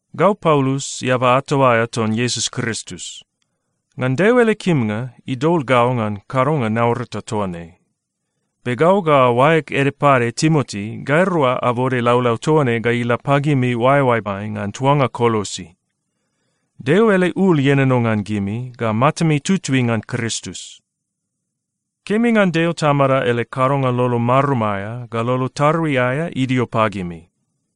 Gau Paulus, eaba ato aea ton Iesus Kristus. Ngan Deo ele kimnga, idol gau ngan kadonga naurata toa ne. Be gau ga oaeg ede pade Timoti, gairua abode laulau toa ne ga ila pagimi oaeoaemai ngan tuanga Kolosi. Deo ele ul ienono ngan gimi ga matami tutui ngan Kristus. Kemi ngan Deo Tamada ele kadonga lolo marum aea ga lolo tarui aea idio pagimi.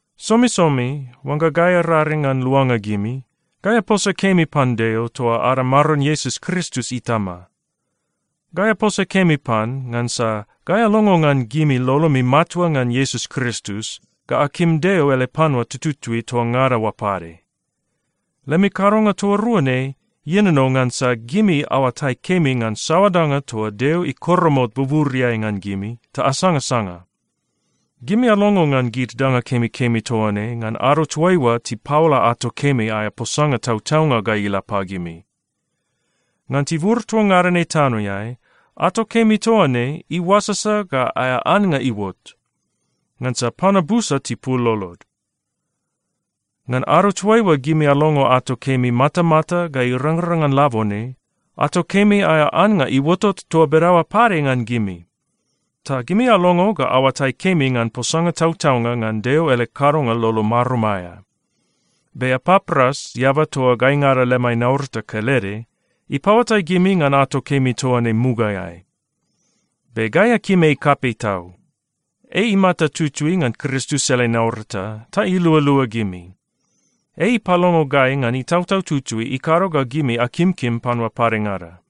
Somisomi oangga gai araring ngan luanga gimi, gai aposa kemi pan Deo toa ada Maron Iesus Kristus Itama. Gai aposa kemi pan ngansa gai alongo ngan gimi lolomi matua ngan Iesus Kristus ga akim Deo ele panua tututui toa ngada oa pade. Lemi kadonga toa rua ne ienono ngansa gimi aoatai kemi ngan saoa danga toa Deo ikoromot buburiai ngan gimi ta asangasanga. Gimi alongo ngan gid danga kemikemi toa ne ngan ado toaiua tipaola ato kemi aea posanga tautaunga ga ila pagimi. Ngan tibur toa ngada ne tanoeai, ato kemi toa ne iuasasa ga aea annga iuot, ngansa panua busa tipul lolod. Ngan ado toaiua gimi alongo ato kemi matamata ga irangrang ngan labone, ato kemi aea annga iuotot toa bedaoa pade ngan gimi. Ta gimi alongo ga aoatai kemi ngan posanga tautaunga ngan Deo ele kadonga lolo marum aea. Be Epapras, eaba toa gaingada lemai naurata kelede, ipaoatai gimi ngan ato kemi toa ne mugaeai. Be gai akim ei kapei tau. Ei imata tutui ngan Kristus ele naurata, ta ilualua gimi. Ei ipalongo gai ngan Itautau Tutui ikado ga gimi akimkim panua padengada.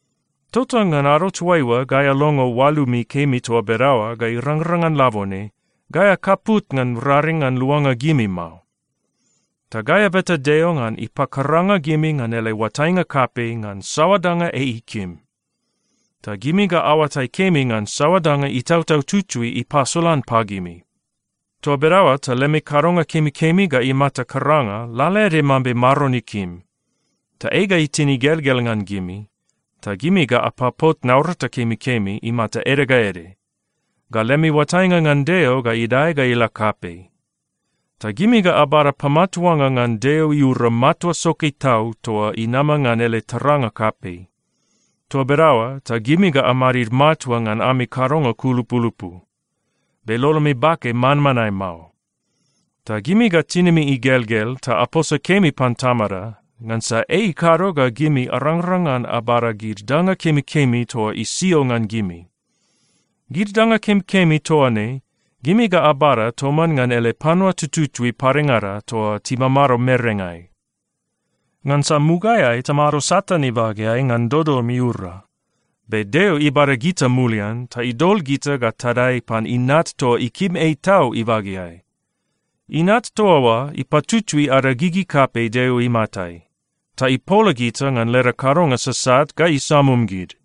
Tota ngan ado toaiua gai alongo oalumi kemi toa bedaoa ga irangrang ngan labone, gai akaput ngan raring ngan luanga gimi mao. Ta gai abeta Deo ngan ipakaranga gimi ngan ele oatainga kapei ngan saoa danga ei ikim, ta gimi ga aoatai kemi ngan saoa danga Itautau Tutui ipasolan pagimi. Toa bedaoa ta lemi kadonga kemikemi ga imata karanga lalaede mambe Maron ikim, ta ei ga itin igelgel ngan gimi. Ta gimi ga apapot naurata kemikemi imata ede ga ede, ga lemi oatainga ngan Deo ga idae ga ila kapei. Ta gimi ga abada pamatuanga ngan Deo iura matua soke tau toa inama ngan ele taranga kapei. Toa bedaoa ta gimi ga amadid matua ngan ami kadonga kulupulupu, be lolomi bake manmanae mao. Ta gimi ga tinimi igelgel ta aposa kemi pan Tamada, ngansa ei ikado ga gimi arangrang ngan abada gid danga kemikemi toa isio ngan gimi. Gid danga kemikemi toa ne, gimi ga abada toman ngan ele panua tututui padengada toa timamado merengai. Ngansa mugaeai tamado Satan ibageai ngan dodom iura, be Deo ibada gita mulian, ta idol gita ga tadae pan Inat toa ikim ei tau ibageai. Inat toa oa ipatutui ada gigi kapei Deo imatai, ta ipola gita ngan leda kadonga sasat ga isamum gid.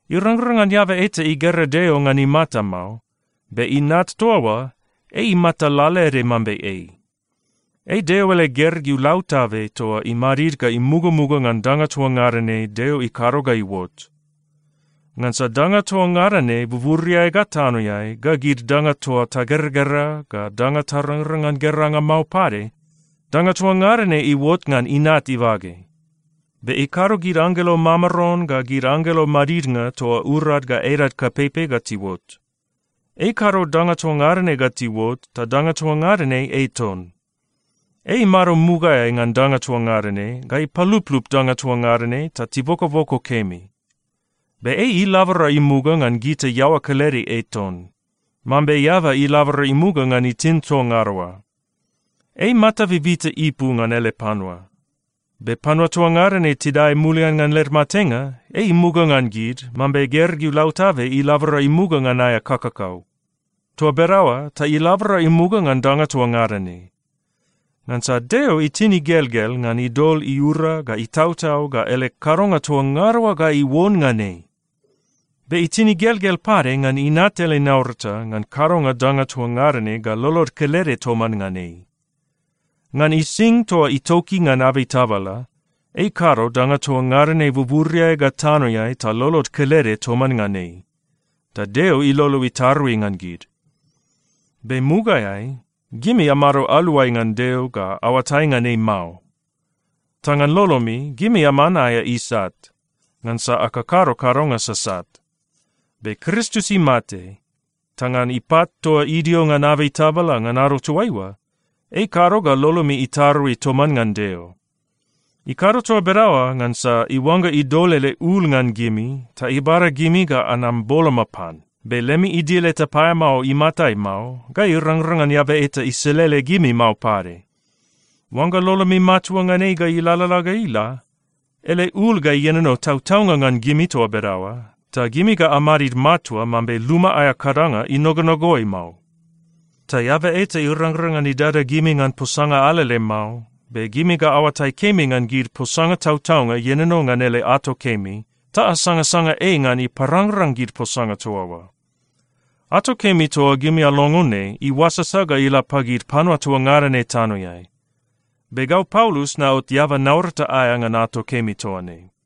Irangrang ngan eaba eta igera Deo ngan imata mao, be Inat toa oa, ei imata lalaede mambe ei. Ei Deo ele gergeu lautabe toa imadid ga imugamuga ngan danga toa ngada ne Deo ikado ga iuot. Ngansa danga toa ngada ne buburiai ga tanoeai, ga gid danga toa tageragera, ga danga tarangrang ngan geranga mao pade, danga toa ngada ne iuot ngan Inat ibage. Be ikado gid anggelo mamaron ga gid anggelo madidnga toa urad ga edad kapeipei ga tiuot. Ei ikado danga toa ngada ne ga tiuot, ta danga toa ngada ne ei ton. Ei imado mugaeai ngan danga toa ngada ne, ga ipaluplup danga toa ngada ne ta tibokoboko kemi. Be ei ilabora imuga ngan gita iaoa kelede ei ton, mambe eaba ilabora imuga ngan itin toa ngada oa. Ei mata bibita ipu ngan ele panua. Be panua toa ngada ne tidae mulian ngan led matenga, ei imuga ngan gid, mambe gergeu lautabe ilabora imuga ngan aea kakakau. Toa bedaoa ta ilabora imuga ngan danga toa ngada ne. Ngansa Deo itin igelgel ngan idol iura ga itautau ga ele kadonga toa ngada oa ga iuon ngan ei. Be itin igelgel pade ngan Inat ele naurata ngan kadonga danga toa ngada ne ga lolod kelede toman ngan ei. Ngan ising toa itoki ngan abei tabala, ei ikado danga toa ngada ne buburiai ga tanoeai ta lolod kelede toman ngan ei, ta Deo ilolo itarui ngan gid. Be mugaeai, gimi amado aluai ngan Deo ga aoatai ngan ei mao. Ta ngan lolomi, gimi aman aea isat, ngansa akakado kadonga sasat. Be Kristus imate, ta ngan ipat toa idio ngan abei tabala ngan ado toaiua, ei ikado ga lolomi itarui toman ngan Deo. Ikado toa bedaoa ngansa iuangga idol ele ul ngan gimi ta ibada gimi ga anam boloma pan, be lemi idil eta paeamao imatai mao, ga irangrang ngan eaba eta iselele gimi mao pade. Oangga lolomi matua ngan ei ga ilalala ga ila, ele ul ga ienono tautaunga ngan gimi toa bedaoa, ta gimi ga amadid matua mambe luma aea kadanga inogonogoi mao. Ta eaba eta irangrang ngan idada gimi ngan posanga alele mao, be gimi ga aoatai kemi ngan gid posanga tautaunga ienono ngan ele ato kemi, ta asangasanga ei ngan iparangrang gid posanga toa oa. Ato kemi toa gimi alongo ne iuasasa ga ila pagid panua toa ngada ne tanoeai. Be gau Paulus naot eaba naurata aea ngan ato kemi toa ne.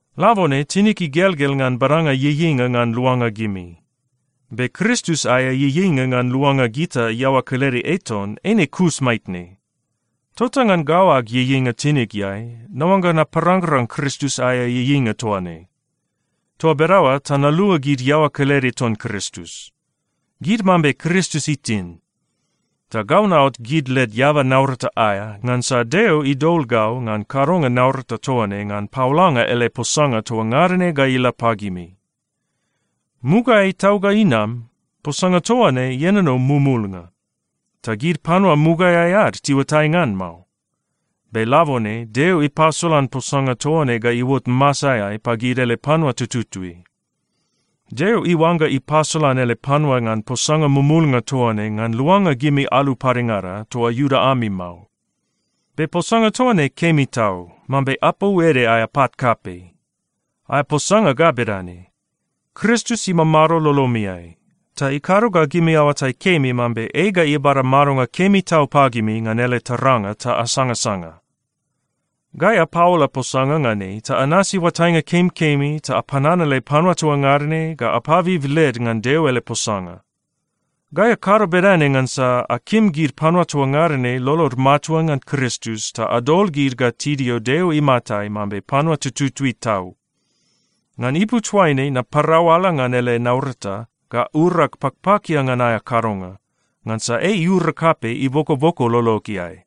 Labone tinig igelgel ngan badanga ieieinga ngan luanga gimi. Be Kristus aea ieieinga ngan luanga gita iaoa kelede ei ton, eine kus maitne. Tota ngan gau ag ieieinga tinigeai, naoangga naparangrang Kristus aea ieieinga toa ne. Toa bedaoa ta nalua gid iaoa kelede ton Kristus. Gid mambe Kristus itin. Ta gau naot gid led eaba naurata aea, ngansa Deo idol gau ngan kadonga naurata toa ne ngan paolanga ele posanga toa ngada ne ga ila pagimi. Mugaeai tau ga inam, posanga toa ne ienono mumulnga, ta gid panua mugaeai ad tiuatai ngan mao. Be labone Deo ipasolan posanga toa ne ga iuot masaeai pagid ele panua tututui. Deo iuangga ipasolan ele panua ngan posanga mumulnga toa ne ngan luanga gimi alu padengada, toa Iuda ami mao. Be posanga toa ne kemi tau, mambe apou ede aea pat kapei. Aea posanga ga bedane: Kristus imamado lolomiai, ta ikado ga gimi aoatai kemi mambe ei ga ibada madonga kemi tau pagimi ngan ele taranga ta asangasanga. Gai apaola posanga ngan ei, ta anasi oatainga kemikemi ta apananale panua toa ngada ne ga apabib led ngan Deo ele posanga. Gai akado bedane ngansa akim gid panua toa ngada ne lolod matua ngan Kristus ta adol gid ga tidio Deo imatai mambe panua tututui tau. Ngan ipu toaine naparau ala ngan ele naurata ga urag pakpakia ngan aea kadonga, ngansa ei iura kapei ibokoboko lologeai.